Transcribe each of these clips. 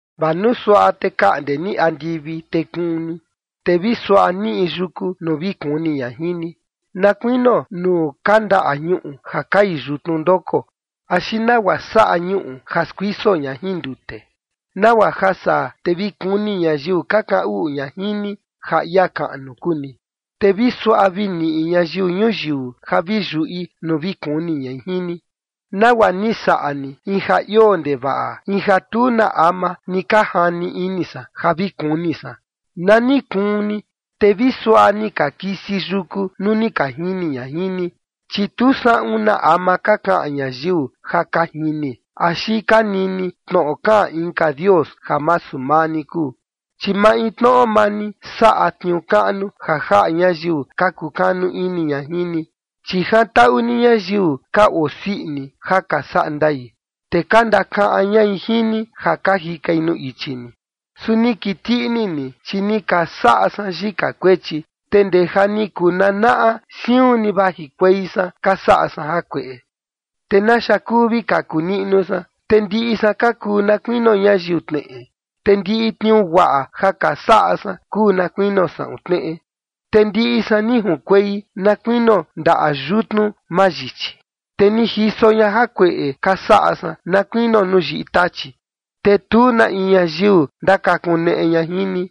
Vaa nuu suaꞌa te kaꞌnde ni andivi te kuun ni, te vi suaꞌa niꞌi yuku nuu vi kuni ña jin ni, na kuinio nuu kandaꞌa ñuꞌu ja kai yutnu ndoko, axi nagua saꞌa ñuꞌu ja skuiso ña jin ndute, nagua ja saa te vi kuni ñayiu ka kaꞌan uꞌu ña jin ni ja ia kaꞌnu kuu ni, te vi suaꞌa vi niꞌi ñayiu ñuyiu ja vi yuꞌi nuu vi kuni ñai jin ni, nagua ni saꞌa ni in ja ioo ndevaꞌa, in ja tu na ama ni ka jani ini san ja vi kuni san. Na ni kuun ni, te vi suaꞌa ni ka kisi yuku nuu ni ka jini ña jin ni. Chi tu saꞌun na ama ka kaꞌan ñayiu ja ka jini axi ka nini tnoꞌo kaꞌan inka dios ja masu maa ni kuu, chi maintnoꞌo maa ni saꞌa tniuu kaꞌnu ja jaꞌa ñayiu ka kukanu ini ña jin ni. Chi jantaꞌu ni ñayiu ka osii ini ja ka saꞌa ndai, te ka ndakaꞌan ñai jin ni ja ka jikai nuu ichi ni. Su ni kiti ini ni, chi ni ka saꞌa san yika kuechi, te ndee ja ni kuu nanaꞌa siun ni vajikuei san ka saꞌa san jakueꞌe. ¿Te naxa kuu vi kaku niꞌnu san? Te ndiꞌi san ka kuu na kuinio ñayiu tneꞌe, te ndiꞌi tniuu guaꞌa ka saꞌa san kuu na kuinio saꞌun tneꞌe. Te ndiꞌi san ni junkuei na kuinio ndaꞌa yutnu mayichi te ni jiso ña jakueꞌe ka saꞌa san na kuinio nuu yiꞌi tachi. Te tu na in ñayiu ndakakuneꞌe ña jin ni,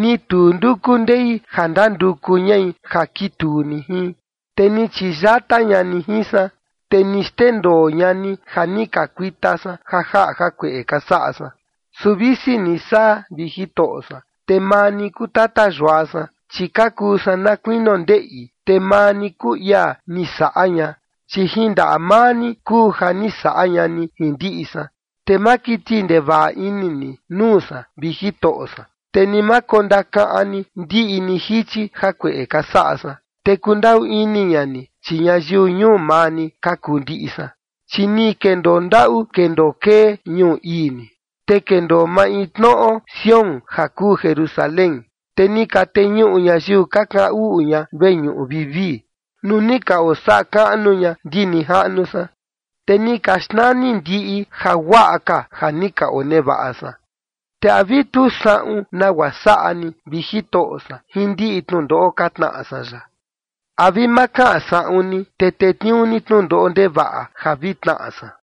ni tu nduku ndei ja ndanduku ñai ja kituu ni jin, te ni chiyata ña ni jin san, te ni xndendoo ña ni ja ni ka kuita san ja jaꞌa jakueꞌe ka saꞌa san. Su visi ni saa, vi Jitoꞌo san, te maa ni kuu tata yua san, chi ka kuu san na kuinio ndeꞌi, te maa ni kuu ia ni saꞌa ña, chi jin ndaꞌa maa ni kuu ja ni saꞌa ña ni jin ndiꞌi san. Te ma kiti ini ndevaꞌa ni nuu san, vi Jitoꞌo san, te ni ma kondakaꞌan ni ndiꞌi ni jichi jakueꞌe ka saꞌa san, te kundaꞌu ini ña ni, chi ñayiu ñuu maa ni ka kuu ndiꞌi san. Chi ni kendoo ndaꞌu kendoo kee ñuu ii ni, te kendoo maintnoꞌo Sión ja kuu Jerusalén. Te ni ka teñuꞌu ñayiu ka kaꞌan uꞌu ña veñuꞌu vivii nuu ni ka ondasaꞌa kaꞌnu ña ndi nijaꞌnu san, te ni ka xnani ndiꞌi jaguaꞌa ka ja ni ka onevaꞌa san. ¿Te a vi tu saꞌun nagua saꞌa ni, vi Jitoꞌo san, jin ndiꞌi tnundoꞌo ka tnaꞌa san yaꞌa? ¿A vi ma kaꞌan saꞌun ni, te tetniuu ni tnundoꞌo ndevaꞌa ja vi tnaꞌa san?